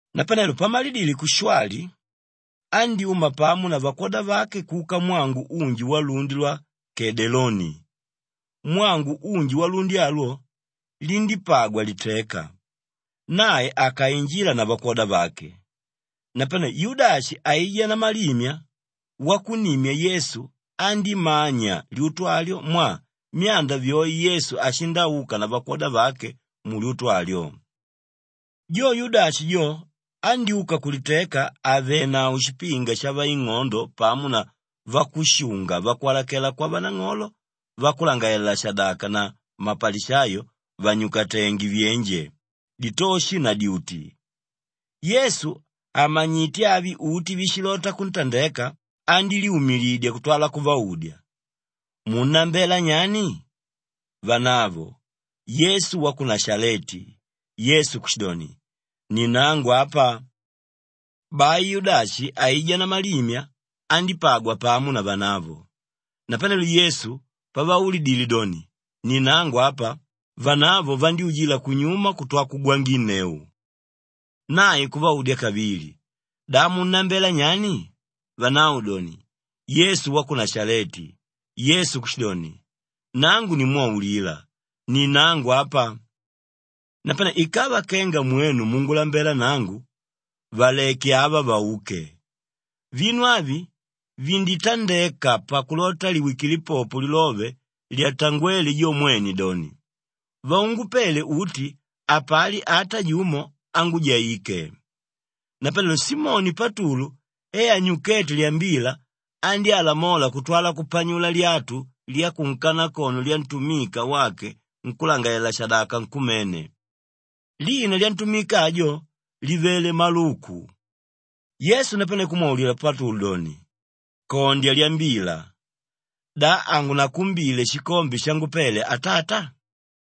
Napanelo pamalidile kushwali, andyúma pamo na vakwoda vake kuka mwangu unji walundi lwa Kedeloni. Mwangu unji walundi alwo, lindípagwa liteka, nae akainjila na vakwoda vake. Napane Yudashi aijá namalimya wakunnimya Yesu andímanya lyutu alyo mwaa myanda vyoe Yesu ashindauka na vakwoda vake mulyutu alyo. Jo Yudashi jo andyúka kuliteka àvenavo shipinga shavaing'odo pamo na vakushunga vakwalakela kwavanang'olo vakulangalalela-shadaka na mapalishayo vànyukatenge vyenje, ditoshi na dyuti. Yesu àmanyite avi uti víshilota kuntandeka, andílyumilidya kutwala kuvaudya, “Munnambela nyani?” Vanavo, “Yesu wa ku Nashaleti.” Yesu kushidoni, “Ni nangu apa.” Bai Yudashi aijá namalimya andípagwa pamo na vanavo. Napanelo Yesu pavaulidile doni, “Ni nangu apa,” vanavo vandyújila kunyuma kutwa kugwanginneu. Nae kuvaudya kavili, “Da munnambela nyani?” Vanavo doni, “Yesu wa ku Nashaleti.” Yesu kushidoni, “Nangu nimwaulila, ni nangu apa. Napane ikava kenga mwenu mungulambela nangu, valeke ava vauke.” Vinu avi vinditandeka pakulota liwikile popo lilove lyatangwéle jo mwene doni, “Vaungupele uti, hapali ata jumo ángujaike.” Napanelo Simoni Patulu e anyukéte lyambila, andyálamola kutwala kupanyula lyatu lyakunkanakono lyantumika wake nkúlangalalela-shadaka nkumene. Lina lyantumika ajo, livele Maluku. Yesu napane kumwaulila Patulu doni, “Kondya lyambila! Da hangunakumbile shikombe shangupele Atata?”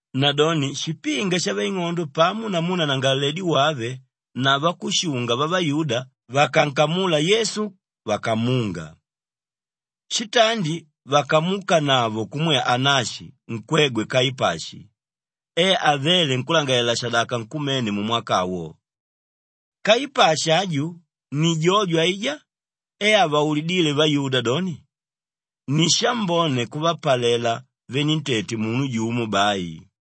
Nadoni shipinga shavaing'ondo pamo namu nanangalaledi wave na vakushunga vavayuda vakankamula Yesu vakamunga. Shitandi vakamuukanavo kumwe Anashi nkwegwe Kaipashi e avéle nkúlangalalela-shadaka nkumene mumwaka awo. Kaipashi aju ni jojo aijá e avaulidíle vayuda doni, ni shambone kuvapalela venentete munu jumo bai.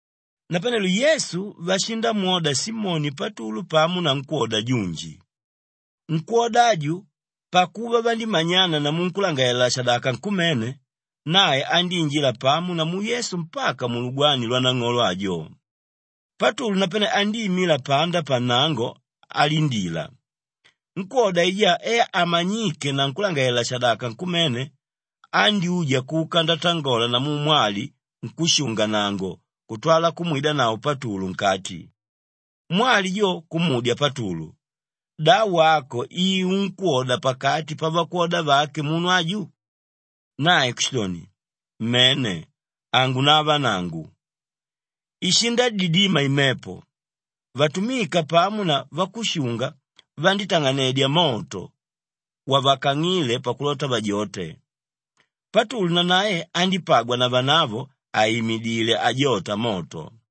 Napanelo Yesu vashindamwoda Simoni Patulu pamo na nkwóda junji. Nkwóda aju, pakuva vandímanyana namu nkúlangalalela-shadaka nkumene, nae andíinjila pamo namu Yesu mpaka mulugwani lwanang'olo ajo. Patulu napane andíimila panda pannango alindila. Nkwóda aijá e amanyíke na nkúlangalalela-shadaka nkumene, andyúja kuka ndatangola namu mwali nkúshunga-nnango kutwala kumwidanavo Patulu nkati. Mwali jo kumudya Patulu, “Da wako i unkwóda pakati pavakwoda vake munu aju?” Nae kushidoni, “Mene, hangunava nangu.” Ishindadidima imepo, vatumika pamo na vakushunga vandítang'anedya moto wavakang'íle pakulota vajote. Patulu nanae andípagwa na vanavo àimidile ajota moto.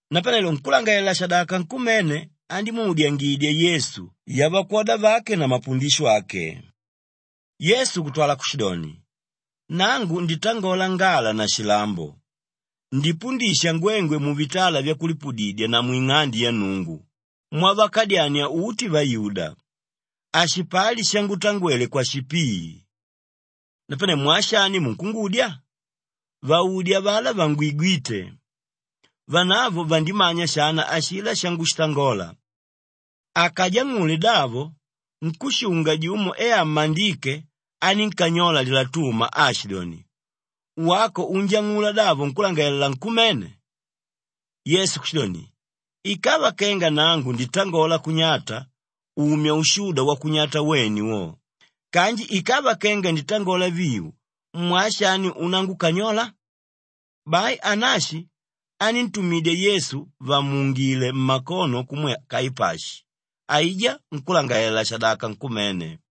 Napanelo nkúlangalalela-shadaka nkumene andímuudyangidya Yesu yavakwoda vake na mapundisho ake. Yesu kutwala kushidoni, “Nangu nditangola ngala na shilambo; ndipundisha ngwengwe muvitala vyakulipudidya na mwing'ande ya Nnungu mwavakadyania uti vayuda. Hashipali shangutangwele kwashipii. Napane mwaa shani munkungudya? Vaudye avalá vangwigwíte. Vanavo vandimanya shana ashilá shangushitangola.” Akajang'ule davo, nkúshunga jumo e ammandíke, anínkanyola lilatuma aashidoni, “Wako unjang'ula davo nkúlangalalela nkumene?” Yesu kushidoni, “Ikava kenga nangu nditangola kunyata, umya ushuda wakunyata wene wo! Kanji ikava kenga nditangola viu mwaa shani unangukanyola?” Bai Anashi aníntumidya Yesu vàmuungile mmakono kumwe Kaipashi, aijá nkúlangalalela-shadaka nkumene.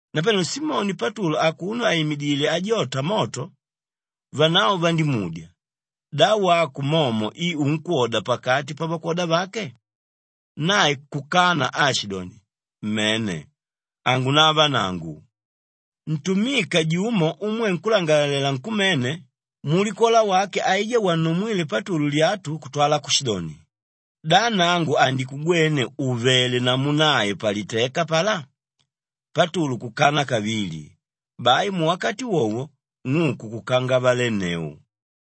Napanelo Simoni Patulu akuno àimidile ajota moto, vanavo vandímudya, “Da wako momo i unkwoda pakati pavakwoda vake?” Nae kukana aashidoni, “Mene, hangunava nangu.” Ntumika jumo umwe nkúlangalalela nkumene, mulikola wake aijá wannumwíle Patulu lyatu kutwala kushidoni, “Da nangu handikugwene ùvele namu nae paliteka apalá?” Patulu kukana kavili. Bai muwakati wowo ng'uku kukangavalenneu.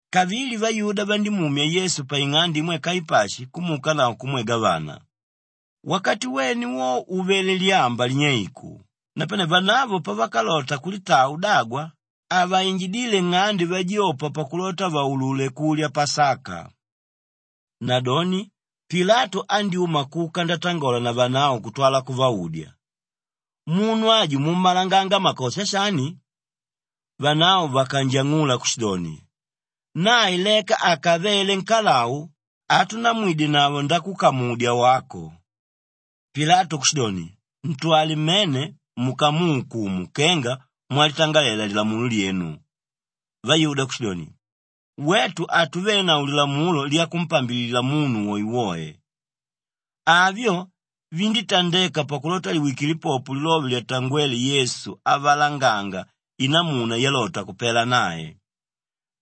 Kavili vayuda vandímumya Yesu paing'ande imwe Kaipashi kumuukanavo kumwe gavana. Wakati wene wo uvele lyamba linyeiku, napane vanavo pavakalota kulitaa udagwa, havainjidíle nng'ande vajopa pakulota vaulule kulya Pasaka. Nadoni Pilatu andyúma kuka ndatangola na vanavo kutwala kuvaudya, “Munu aju mummalanganga makosha shani?” Vanavo vakanjang'ula kushidoni, “Nae leka akavele nkalau, hatunamwidenavo ndakukamudya wako.” Pilatu kushidoni, “Ntwale mmene mukamuukumu kenga mwalitangalela lilamulo lyenu.” Vayuda kushidoni, “Wetu hatuvenavo lilamulo lyakumpambilila munu woewoe.” Avyo vindítandeka pakulota liwikile popo lilove lyatangwéle Yesu avalanganga inamuna yalota kupela nae.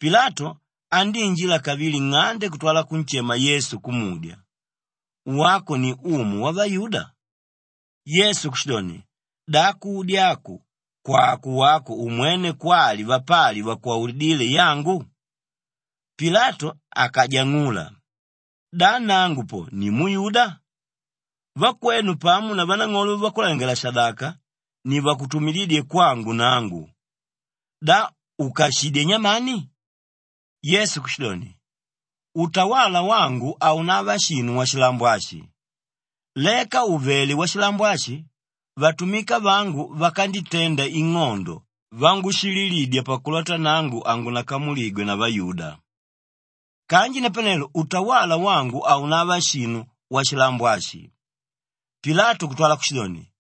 Pilatu andíinjila kavili nng'ande kutwala kunshema Yesu kumudya, “Wako ni umu wavayuda?” Yesu kushidoni, “Da kudya aku kwàko wako umwene kwali vapali vakwaulidíle yangu?” Pilatu akajang'ula, “Da nangu po ni muyuda? Vakwenu pamo na vanang'olo vavakulangalalela-shadaka ni vakutumidídye kwangu nangu. Da ukashidyé nyamani?” Yesu kushidoni, “Utawala wangu haunava shinu washilambo ashi. Leka ùvele washilambo ashi, vatumika vangu vakanditenda ing'ondo vangushililidya pakulota nangu hangunakamuligwe na vayuda. Kanji napanelo utawala wangu haunava shinu washilambo ashi.” Pilatu kutwala kushidoni,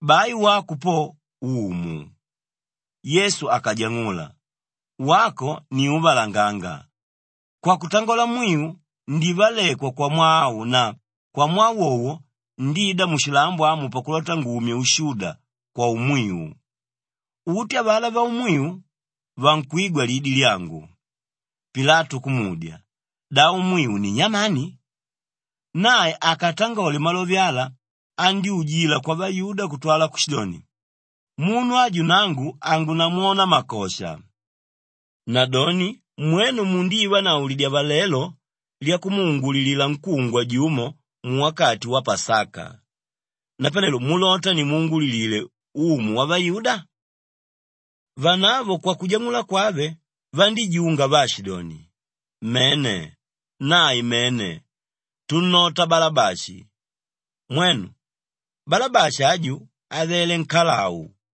“Bai wako po, umu!” Yesu akajang'ula, “Wako ni úvalanganga. Kwakutangola mwiu ndivalekwa kwamwaa au na kwamwaa wowo ndida mushilambo amu pakulota ngumye ushuda kwaumwiu. Uti avalá vaumwiu, vankwigwa lidi lyangu.” Pilatu kumudya, “Da umwiu ni nyamani?” Nae akatangole malove ala andyújila kwavayuda kutwala kushidoni, “Munu aju nangu hangunamwona makosha. Nadoni mwenu mundivanavo lidyavalelo lyakumuungulilila nkúngwa jumo muwakati wa Pasaka. Napane mulota nimuungulilile ‘umu wavayuda’?” Vanavo kwakujang'ula kwave, vandíjunga vaashidoni, “Mene, nae mene! Tunnota Balabashi!” Mwenu, Balabashi aju avele nkalau.